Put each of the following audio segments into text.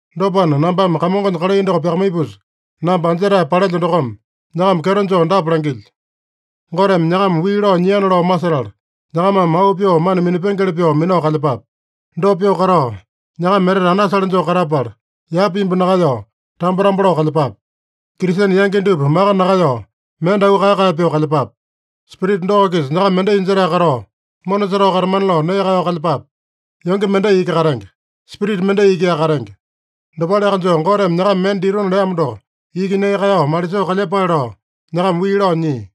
Dopana, nambame Kamongonya kalai doko pyakamaipusa, namba anjetae palelyo dokome, nyakama kyeto joo dapa langilyo: Goteme nyakama wii lao nyiana lao masetala, nyakamame auu pyoo mana minapengeli pyoo minao kalyepape. Dopa pyoo katao, nyakama etete anasale joo katapala, yapa imbu nakaeyao, tambo-tambo lao kalyepape. Kristene yangi dupa maka nakaeyao, mende auu kae-kae pyoo kalyepape. Spirita doko-kisa nyakama mendai jetae katao, mona setao katamana lao nee kaeyao kalyepape. Yonge mendai iki katenge. Spirita mendai ikiaka katenge. Dopaleaka joo, Goteme nyakama mende ditona leamo doko iki nee kaeyao malisoo kalyepale lao nyakama wii lao nyia.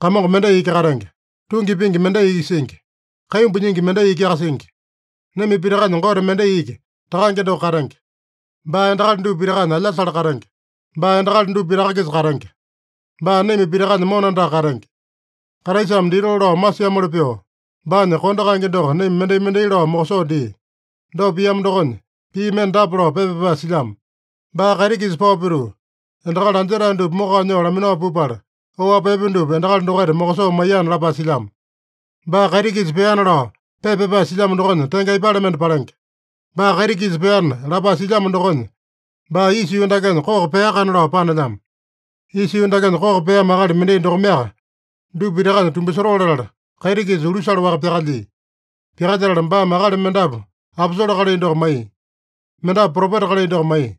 Kamongo mendai iki katenge. Tungi pingi mendai iki singi. Kaimbu nyingi mendai ikiaka singi. Naima pitakanya Gote mendai iki, Takange doko katenge. Baa endakali dupa pitakanya alyasale katenge. Baa endakali dupa pitaka-kisa katenge. Baa naima pitakanya mona andaka katenge. Kraisame ditoo lao masiamoli pyoo, baanya kondo kaenge doko naima mendai-mendai lao mokosoo dia. Dopa piamo dokonya, pii mende dapa lao pepa pyapae silyamo: “Baa kaiti-kisa pao pituu, endakali anjetae dupa mokao nyoo laminao pupala, oapi epe dupa endakali dokaita mokosoo maiyana” lapae silyamo. “Baa kaiti-kisa peana” lao pepa pyapae silyamo dokonya tenge aipale mende palenge? “Baa kaiti-kisa peana” lapae silyamo dokonya, baa isa yuu dakenya koko peakana lao panelyamo. Isa yuu dakenya koko peamo akali mendai dokomeaka dupa pitakanya tumbasotoo latala, kaiti-kisa ulusale-waka pyakalyia. Pyakalyetala baame akali mendapu aposole kalai doko maiya. Mendapu propeta kalai doko maiya.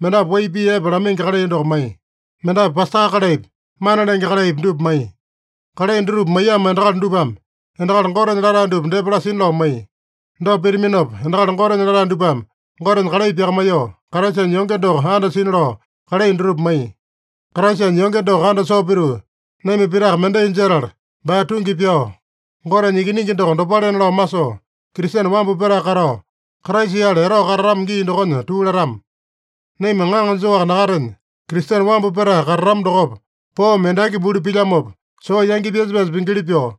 Mendapu wai pii epe lamaingi kalai doko maiya. Mendapu pasta kalaipi, mana lenge kalaipi dupa maiya. Kalai dutupa maiyamo endakali dupame endakali Gotenya latae dupa depa lasina lao maiya. Dopa pitaminopa, endakali Gotenya latae dupame Gotenya kalai pyakamaiyoo, Kraisanya yonge doko andasina lao kalai dutupa maiya. Kraisanya yonge doko andasoo pituu, naima pitaka mendai jetala baa tungi pyao, Gotenya Ikiningi doko dopalena lao masoo, Kristene wambu petae katao, Kraisa-yale etao katatama gii dokonya tuu latama. Naima ŋaŋa joaka nakatenya, Kristene wambu petae katatama dokopa, poome endaki buli pilyamopa, soo yangi pyasa-pyasa pingili pyoo,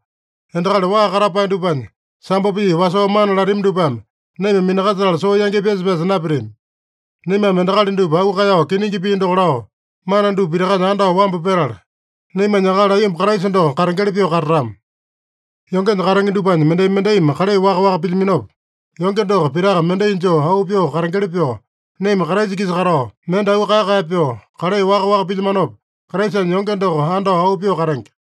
endakali waa katapae dupanya sambo pii wasoo mana latami dupame naima minakasetala soo yangi pyasa-pyasa napitami. Naimame endakali dupa auu kaeyao kiningi pii doko lao, mana dupa pitakanya andao wambu petala, naimanya akali aiyomba Kraisa doko katengeli pyoo katatama. Yongenya katenge dupanya mendai-mendaimi kalai waka-waka pilyaminopa, yonge doko pitaka mendai joo auu pyoo katengeli pyoo, naima Kraisa-kisa katao, mende auu kae-kae pyoo, kalai waka-waka pilyamanopa, Kraisanya yonge doko andao auu pyoo katenge.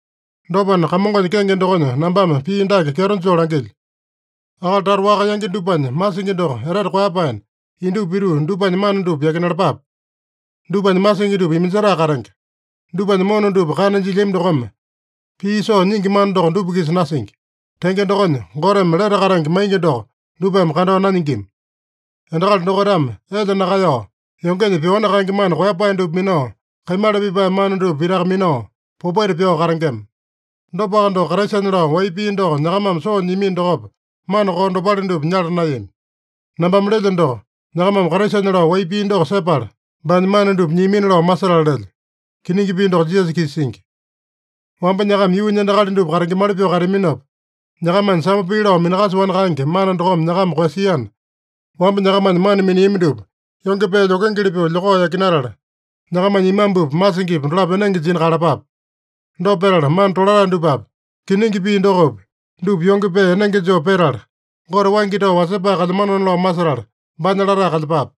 Dopana, Kamongonya kenge dokonya nambame pii dake kyeto joo langilyo: Akali tata waka yangi dupanya masingi doko etete koeyapaena, indupa pituu dupanya mana dupa yakinalapape. Dupanya masingi dupa iminjetae katenge. Dupanya mona dupa kana jilyami dokome, pii soo nyingi mana doko dupa-kisa nasingi. Tenge dokonya, Goteme lete katenge maingi doko dupame kandao nanyingima. Endakali dokaitame elya nakaeyao, yongenya pyoani kaenge mana koeyapae dupa minao, kaimala pipae mana dupa pitaka minao, popaita pyao katengema. Dopaka doko, Kraisanya lao wai pii doko nyakamame soo nyiamino dokopa, mana koo dopale dupa nyala naeyami. Nambame lelyo doko, nyakamame Kraisanya lao wai pii doko sepala, baanya mana dupa nyiamina lao masetala lelyo. (Kiningi pii doko Jisasa-kisa singi.) Wamba nyakama yuunya endakali dupa katengemali pyoo kateaminopa, nyakamanya sambo pii lao minakasoani kaenge mana dokome nyakama koeyasiana, wamba nyakamanya mana miniami dupa yonge pee lyokengeli pyoo lyokao yakinatala, nyakamanya imambupa, masingipa dolapo enenge jina kaeyalapape. Dopa petala, mana tolatae dupapi, kiningi pii dokopi, dupa yonge pee enenge joo petala, Gote waingi tao wasepae kalyamanona lao masetala, baanya latae kalyepape.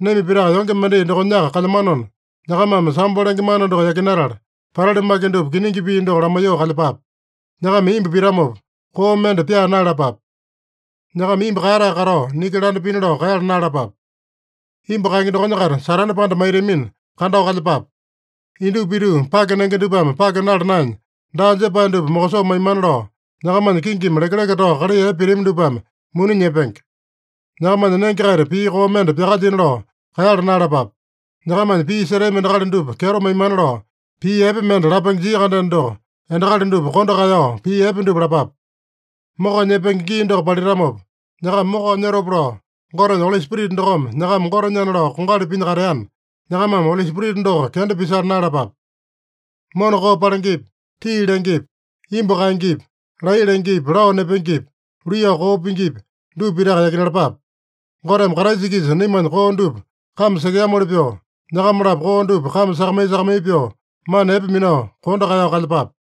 Naima pitaka yonge mendai dokonyaka kalyamanona, nyakamame sambo lenge mana doko yakinatala, patali maki dupa kiningi pii doko lamaiyoo kalyepape. Nyakama imbu pitamopa, koo mende pyaa naeyalapape. Nyakama imbu kaeyatae katao, niki landa pina lao kaeyala naeyalapape. Imbu kaenge dokonya-kaita Satane panda maitamina, kandao kalyepape. Indupa pituu, pake nenge dupame pake nala naenya, daa jepae dupa mokosoo maimana lao, nyakamanya kingimi lekeleke tao kalai epe pitami dupame muni nyepenge. Nyakamanya nenge-kaita pii koo mende pyakalyina lao kaeyala naeyalapape. Nyakamanya pii setami endakali dupa kyeto maimana lao, pii epe mende lapenge jia-kandeno doko, endakali dupa kondo kaeyao pii epe dupa lapape. Mokao nyepenge gii doko palitamopa nyakama mokao nyotopa lao, Gotenya Oli Spirita dokome nyakama Gotenyana lao kongali pinya kateana, nyakamame Oli Spirita doko kenda pisala naeyalapape. Mona koo palengepi, tii lengepi, imbu kaengepi, laiya lengepi, lao nepengepi, luiyao koo pingipi, dupa pitaka yakinalapape. Goteme Kraisa-kisa naimanya koo dupa kame sekeamoli pyoo, nyakama-lapo koo dupa kame sakamai-sakamai pyoo, mana epe minao, kondo kaeyao kalyepape.